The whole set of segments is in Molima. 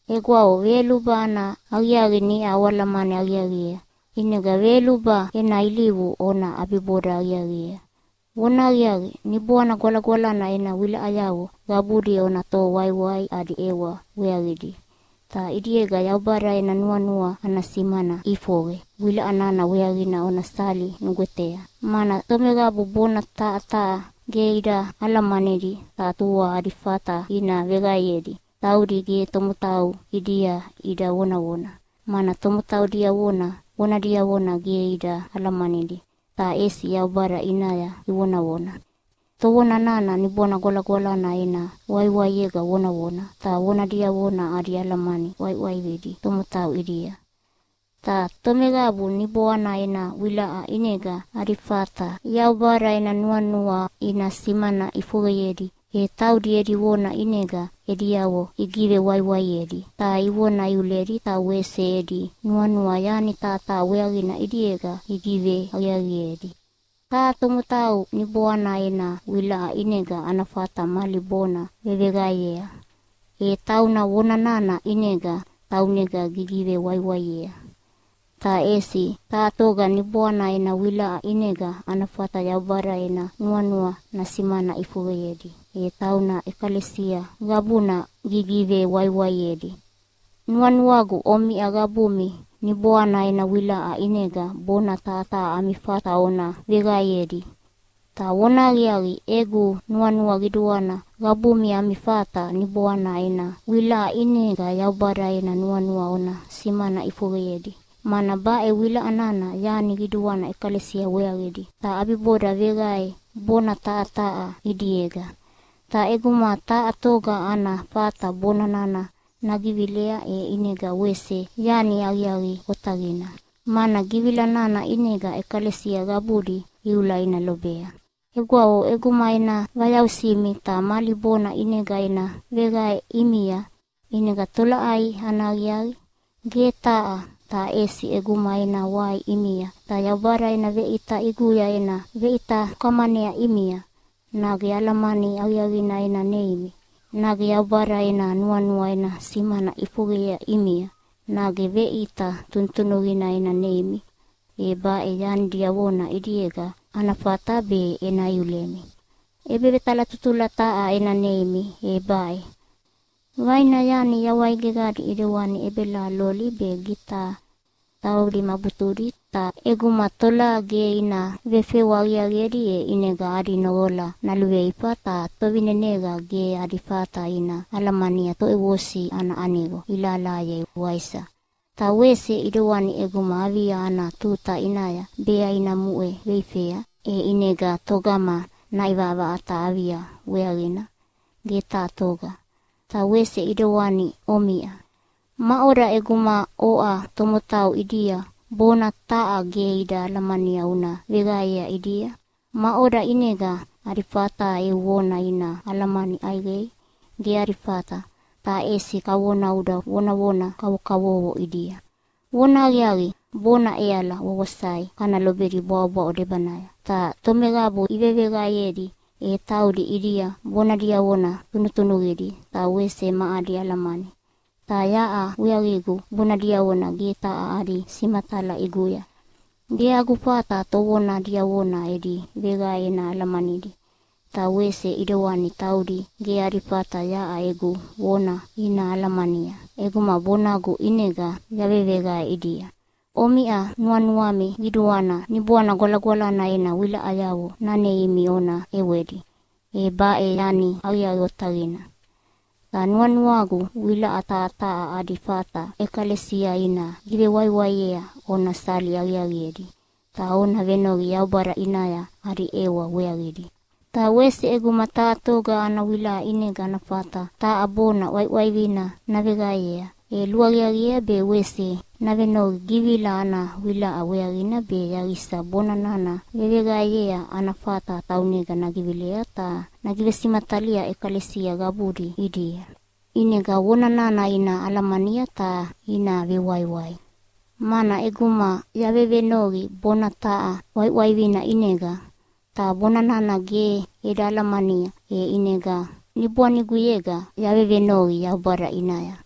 Egwavo, veyoluba ana aqiaqi niʼa oalamani aqiaqiea, ʼinega veyoluba ena ilivu ona ʼabiboda aqiaqiea. Vonahaqiaqi, Niboana Gwalagwalana ena wilaʼayavo qabudi ona toho waiwai adi ʼewa weaqidi, ta ʼidiega Yaubada ena nuanua ana simana ʼifoqe wilaʼa nana weaqina ona sali nugwetea. Mana tomeqabu bona taha taha ge ida alamanidi ta tua adi fata ina veqaeyedi, taudi ge tomotau ʼidia ida vonavona, mana tomotau diavona vona diavona ge ida alamanidi, ta ʼesi Yaubada ʼinaya ivonavona. Tovona nana Niboana Gwalagwalana ena waiwaiega vonavona, ta vona diavona adi alamani ʼwaiʼwaividi tomotau ʼidia. Ta tomeqabu Niboana ena wilaʼa ʼinega adi fata Yaubada ena nuanua ina simana ʼifoqeyedi, e taudi edi vona ʼinega ediavo igivewaiwaiedi, ta ivona iuledi ta wese edi nuanua yani taha taha weaqina ʼidiega igiveaqiaqiedi. Taha tomotau Niboana ena wilaʼa ʼinega ana fata mali bona veveqaeyea, e tauna vona nana ʼinega taunega gigivewaiwaiea. Ta ʼesi taha toga Niboana ena wilaʼa ʼinega ana fata Yaubada ena nuanua nasimana ʼifoqeyedi, e tauna ʼekalesia qabuna gigivewaiwaiedi. Nuanuagu omiʼa qabumi Niboana ena wilaʼa ʼinega bona taha taha ami fata ona veqaeyedi. Ta vonahaqiaqi, egu nuanua qiduana qabumi ami fata Niboana ena wilaʼa ʼinega Yaubada ena nuanua ona simana ʼifoqeyedi. Mana baʼe wilaʼa nana yani qiduana ʼekalesia weaqidi, ta ʼabiboda veqae bona taha taha ʼidiega. Ta ʼeguma taha toga ana fata bona nana nagivilea, e ʼinega wese yani aqiaqi otaqina, mana givila nana ʼinega ʼekalesia qabudi iula ina lobea. Egwavo, ʼeguma ena vayausimi ta mali bona ʼinega ena veqae ʼimia ʼinega tolaʼai ana aqiaqi? Ge taha! Ta ʼesi ʼeguma ena wai ʼimia ta Yaubada ena veʼita ʼiguya ena veʼita ukamanea ʼimia, nage alamani aqiaqina ena neimi, nage Yaubada ena nuanua ena simana ʼifoqeyea ʼimia, nage veʼita tunutunuqina ena neimi, e baʼe yani diavona ʼidiega ana fata be ena iulemi. ʼEbevetalatutula taha ena neimi, e baʼe: Vaina yani yawai geqadi ʼidewani ʼebelaha loli be gitaha taudi ma butudi, ta ʼeguma tolaha ge ina vefewa aqiaqiedi, e ʼinega adi noqola naluveifa ta tovineneqa ge adi fata ina alamania toʼevosi ana aniqo ilahalahayei, waisa? Ta wese ʼidewani ʼeguma avia ana tuta ʼinaya bea ina muʼe veifea, e ʼinega togama naʼivaʼavaʼata avia weaqina? Ge taha toga! Ta wese ʼidewani omiʼa. Maʼoda ʼeguma oʼa tomotau ʼidia bona taha ge ida alamania una veqaeyea ʼidia? Maʼoda ʼinega adi fata eu vona ina alamani ʼaiqei? Ge adi fata, ta ʼesi kavona uda vonavona kavokavovo ʼidia. Vonahaqiaqi, bona ʼeala wawasai kana lobedi bwaʼobwaʼo debanaya. Ta tomeqabu iveveqaeyedi, e taudi ʼidia bona diavona tunutunuqidi ta wese ma adi alamani. Ta yaʼa weaqigu bona diavona ge taha adi simatala ʼiguya. Ge agu fata tovona diavona edi veqae ena alamanidi, ta wese ʼidewani taudi, ge adi fata yaʼa egu vona ina alamania ʼeguma bonagu ʼinega yaveveqae ʼidia. Omiʼa nuanuami qiduana Niboana Gwalagwalana ena wilaʼayavo naneimi ona ʼewedi. E baʼe yani aqiaqi otaqina. Ta nuanuagu wilaʼa taha taha adi fata ʼekalesia ina givewaiwaiea ona sali aqiaqiedi, ta ona venoqi Yaubada ʼinaya adi ʼewa weaqidi. Ta wese ʼeguma taha toga ana wilaʼa ʼinega ana fata taha bona ʼwaiʼwaivina naveqaeyea, e luaqiaqiea be wese navenoqi givila ana wilaʼa weaqina be yaqisa bona nana veveqaeyea ana fata taunega nagivilei ta nagivesimatalia ʼekalesia qabudi ʼidia, ʼinega vona nana ina alamania ta ina vewaiwai. Mana ʼeguma yavevenoqi bona taha ʼwaiʼwaivina ʼinega, ta bona nana ge eda alamania, e ʼinega niboaniguyega yavevenoqi Yaubada ʼinaya.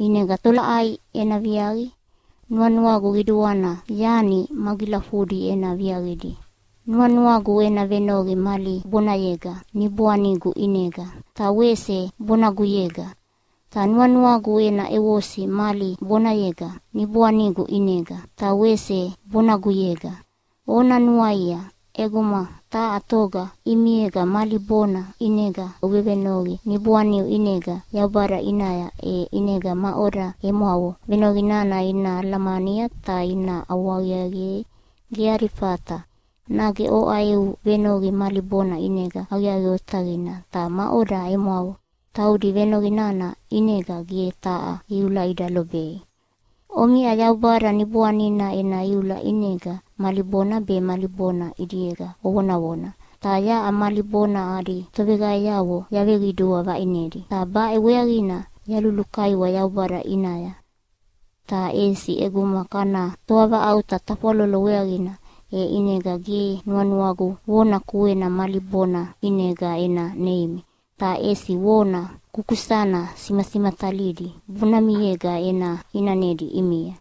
ʼInega tolaʼai ena viaqi? Nuanuagu qiduana yani magilafudi ena viaqidi. Nuanuagu ena venoqi mali bonayega niboanigu ʼinega, ta wese bonaguyega. Ta nuanuagu ena ʼevosi mali bonayega niboanigu ʼinega, ta wese bonaguyega. Ona nuaia, ʼeguma taha toga ʼimiega mali bona ʼinega uvevenoqi niboaniu ʼinega Yaubada ʼinaya, e ʼinega maʼoda emwavo venoqi nana ina alamania ta ina ʼawahaqiaqiei? Ge adi fata. Nage oʼa eu venoqi mali bona ʼinega aqiaqi otaqina, ta maʼoda emwavo? Taudi venoqi nana ʼinega ge taha iula ida lobei. Omiʼa Yaubada Niboanina ena iula ʼinega mali bona be mali bona ʼidiega ovonavona, ta yaʼa mali bona adi toveqaeavo yaveqidua vaʼinedi, ta baʼe weaqina yalulukaiwa Yaubada ʼinaya. Ta ʼesi ʼeguma kana toavaʼauta tafwalolo weaqina, e ʼinega ge nuanuagu vona kuena mali bona ʼinega ena neimi, ta ʼesi vona kukusana simasimatalidi bonamiega ena ʼinanedi ʼimia.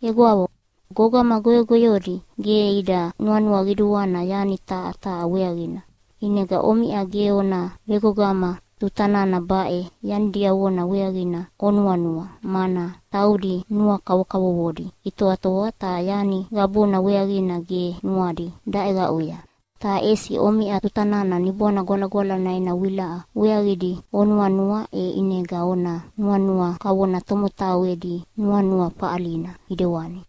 Egwavo, gogama goyogoyodi ge ida nuanua qiduana yani taha taha weaqina, ʼinega omiʼa ge ona vegogama tuta nana baʼe yani diavona weaqina onuanua, mana taudi nua kavokavovodi itoatoa ta yani qabuna weaqina ge nuadi daʼeqaʼuya. Ta ʼesi omiʼa tuta nana Niboana Gwalagwalana ena wilaʼa weaqidi onuanua, e ʼinega ona nuanua kavona tomotau edi nuanua faʼalina ʼidewani.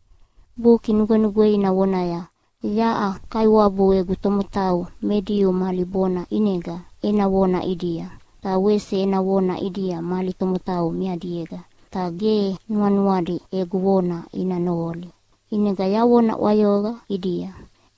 Buki Nugwenugweina vonaya, “Yaʼa Kaiwabu egu tomotau me Diu mali bona ʼinega ena vona ʼidia, ta wese ena vona ʼidia mali tomotau meadiega. Ta ge nuanuadi egu vona ina noqoli, ʼinega yavona ʼwayoqa ʼidia.”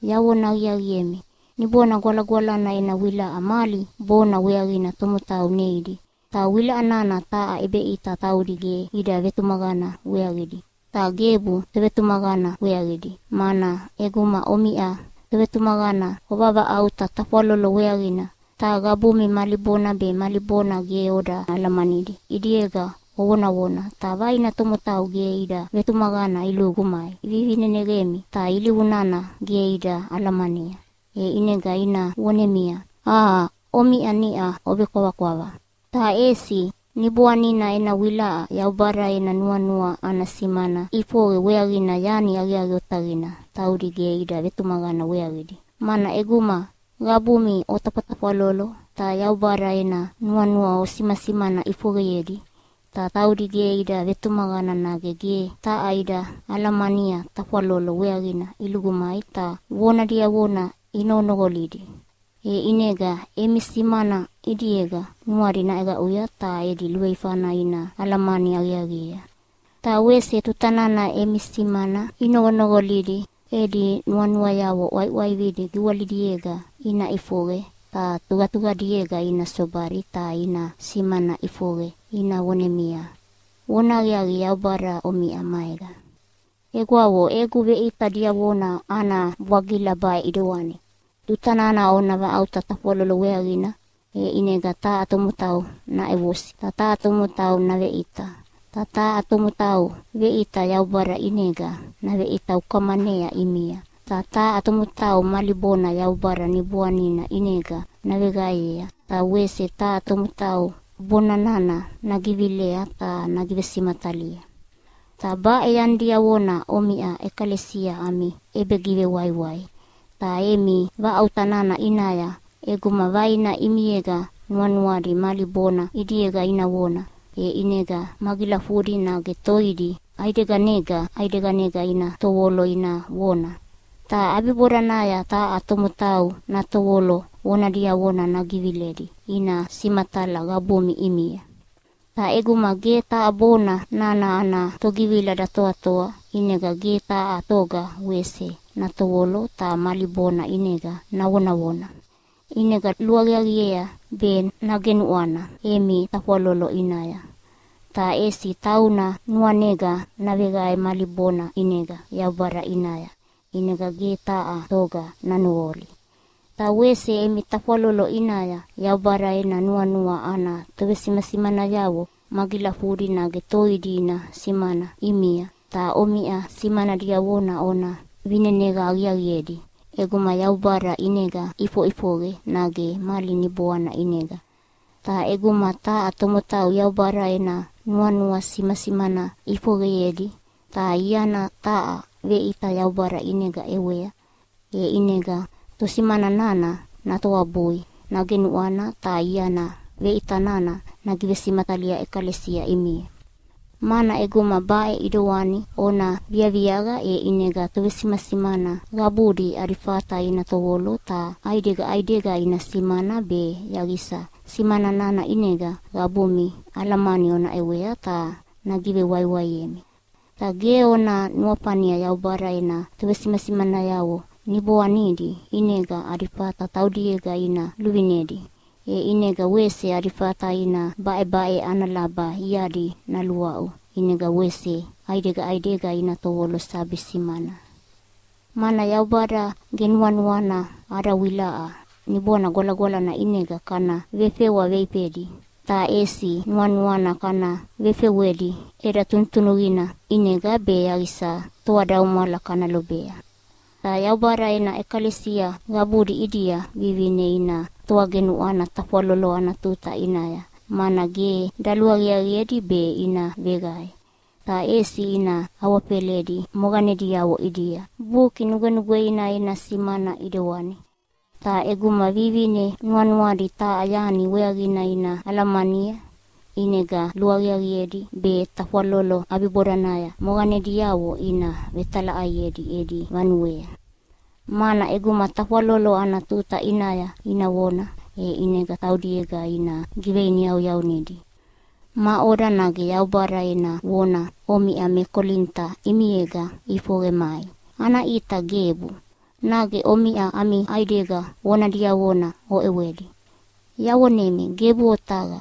Yavona aqiaqiemi, Niboana Gwalagwalana ena wilaʼa mali bona weaqina tomotau neidi, ta wilaʼa nana taha ʼebeʼita taudi ge ida vetumaqana weaqidi, ta gebu tovetumaqana weaqidi. Mana ʼeguma omiʼa tovetumaqana ovavaʼauta tafwalolo weaqina ta qabumi mali bona be mali bona ge oda alamanidi ʼidiega ovonavona, ta vaina tomotau ge ida vetumaqana ilugu mai ivivineneqemi ta ilivu nana ge ida alamania, e ʼinega ina vonemia, “Aa, omiʼa niʼa ovekwavakwava!” Ta ʼesi Niboanina ena wilaʼa Yaubada ena nuanua ana simana ʼifoqe weaqina yani aqiaqi otaqina taudi ge ida vetumaqana weaqidi. Mana ʼeguma qabumi otafwatafwalolo ta Yaubada ena nuanua osimasimana ʼifoqeyedi, ta taudi ge ida vetumaqana nage ge taha ida alamania tafwalolo weaqina ilugu mai ta vona diavona inoqonoqolidi. E ʼinega emi simana ʼidiega nuadi naʼeqaʼuya ta edi luveifana ina alamani aqiaqiea. Ta wese tuta nana emi simana inoqonoqolidi edi nuanuayavo ʼwaiʼwaividi giwalidiega ina ʼifoqe ta tuqatuqadiega ina sobadi ta ina simana ʼifoqe ina vonemia, “Vonahaqiaqi, Yaubada omiʼa maega!” Egwavo, egu veʼita diavona ana bwagila baʼe ʼidewani: Tuta nana ona vaʼauta tafwalolo weaqina, e ʼinega taha tomotau naʼevosi. Ta taha tomotau naveʼita. Ta taha tomotau veʼita Yaubada ʼinega naveʼita ukamanea ʼimia. Ta taha tomotau mali bona Yaubada Niboanina ʼinega naveqaeyea, ta wese taha tomotau bona nana nagivilea ta nagivesimatalia. Ta baʼe yani diavona omiʼa ʼekalesia ami ʼebegivewaiwai. Ta emi vaʼauta nana ʼinaya ʼeguma vaina ʼimiega nuanuadi mali bona ʼidiega ina vona, e ʼinega magilafudi nage toidi ʼaideganega ʼaideganega ina tovolo ina vona. Ta ʼabibodanaya taha tomotau natovolo vona diavona nagiviledi ina simatala qabumi ʼimia. Ta ʼeguma ge taha bona nana ana togivila datoatoa, ʼinega ge taha toga wese natovolo ta mali bona ʼinega navonavona. ʼInega luaqiaqiea be nagenuʼwana emi tafwalolo ʼinaya, ta ʼesi tauna nuanega naveqae mali bona ʼinega Yaubada ʼinaya, ʼinega ge taha toga nanoqoli. Ta wese emi tafwalolo ʼinaya Yaubada ena nuanua ana tovesimasimanayavo magilafudi nage toidi ina simana ʼimia, ta omiʼa simana diavona ona vineneqa aqiaqiedi ʼeguma Yaubada ʼinega ʼifoʼifoqe, nage mali niboana ʼinega. Ta ʼeguma taha tomotau Yaubada ena nuanua simasimana ʼifoqeyedi, ta iana taha veʼita Yaubada ʼinega ʼewea, e ʼinega tosimana nana natoabui, nagenuʼwana ta iana veʼita nana nagivesimatalia ʼekalesia ʼimia. Mana ʼeguma baʼe ʼidewani ona viaqia, e ʼinega tovesimasimana qabudi adi fata ina tovolo, ta ʼaidega ʼaidega ina simana be yaqisa simana nana ʼinega qabumi alamani ona ʼewei ta nagivewaiwaiemi. Ta ge ona nuafania Yaubada ena tovesimasimanayavo niboanidi ʼinega adi fata taudiega ina luvinedi, e ʼinega wese adi fata ina baʼebaʼe ana laba iadi naluaʼu ʼinega wese ʼaidega ʼaidega ina tovolo sabi simana. Mana Yaubada ge nuanuana ada wilaʼa Niboana Gwalagwalana ʼinega kana vefewa veifedi, ta ʼesi nuanuana kana vefewedi ʼeda tunutunuqina ʼinega be yaqisa toadaumwala kana lobea. Ta Yaubada ena ʼekalesia qabudi ʼidia vivine ina toagenuʼwana tafwalolo ana tuta ʼinaya, mana ge daluaqiaqiedi be ina veqae. Ta ʼesi ina awafeledi moqanediavo ʼidia, Buki Nugwenugweina ena simana ʼidewani. Ta ʼeguma vivine nuanuadi taha yani weaqina ina alamania, ʼinega luaqiaqiedi be tafwalolo ʼabibodanaya moqanediavo ina vetalaʼaiedi edi vanuea. Mana ʼeguma tafwalolo ana tuta ʼinaya ina vona, e ʼinega taudiega ina giveiniyauyaunidi. Maʼoda, nage Yaubada ena vona omiʼa me Kolinita ʼimiega ʼifoqe mai? Ana ʼita, gebu! Nage omiʼa ami ʼaidega vona diavona oʼewedi. Yavonemi, gebu otaqa!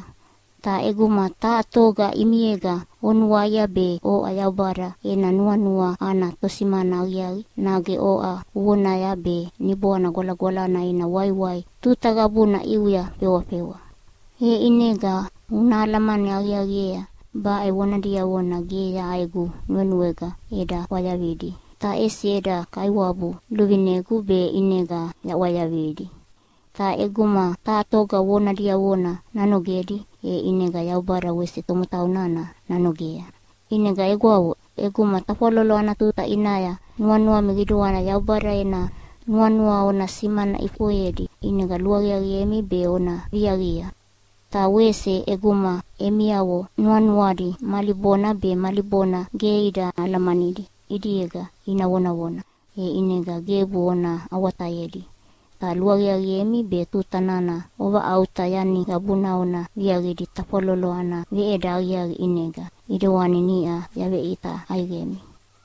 Ta ʼeguma taha toga ʼimiega unuaia be oʼa Yaubada ena nuanua ana tosimana aqiaqi, nage oʼa uvonaya be Niboana Gwalagwalana ena waiwai tuta qabuna ʼiuya fewafewa. E ʼinega una alamani aqiaqiea, baʼe vona diavona ge yaʼa egu nuenuega eda ʼwayavidi, ta ʼesi eda Kaiwabu luvinegu be ʼinega yaʼwayavidi. Ta ʼeguma taha toga vona diavona nanogedi, e ʼinega Yaubada wese tomotau nana nanogea. ʼInega egwavo, ʼeguma tafwalolo ana tuta ʼinaya nuanuami qiduana Yaubada ena nuanua ona simana ʼifoqeyedi ʼinega luaqiaqiemi be ona viaqia. Ta wese ʼeguma emiavo nuanuadi mali bona be mali bona ge ida alamanidi ʼidiega ina vonavona, e ʼinega gebu ona awatayedi. Ta luaqiaqiemi be tuta nana ovavaʼauta yani qabuna ona viaqidi tafwalolo ana veʼeda aqiaqi ʼinega ʼidewani niʼa yaveʼita ʼaiqemi.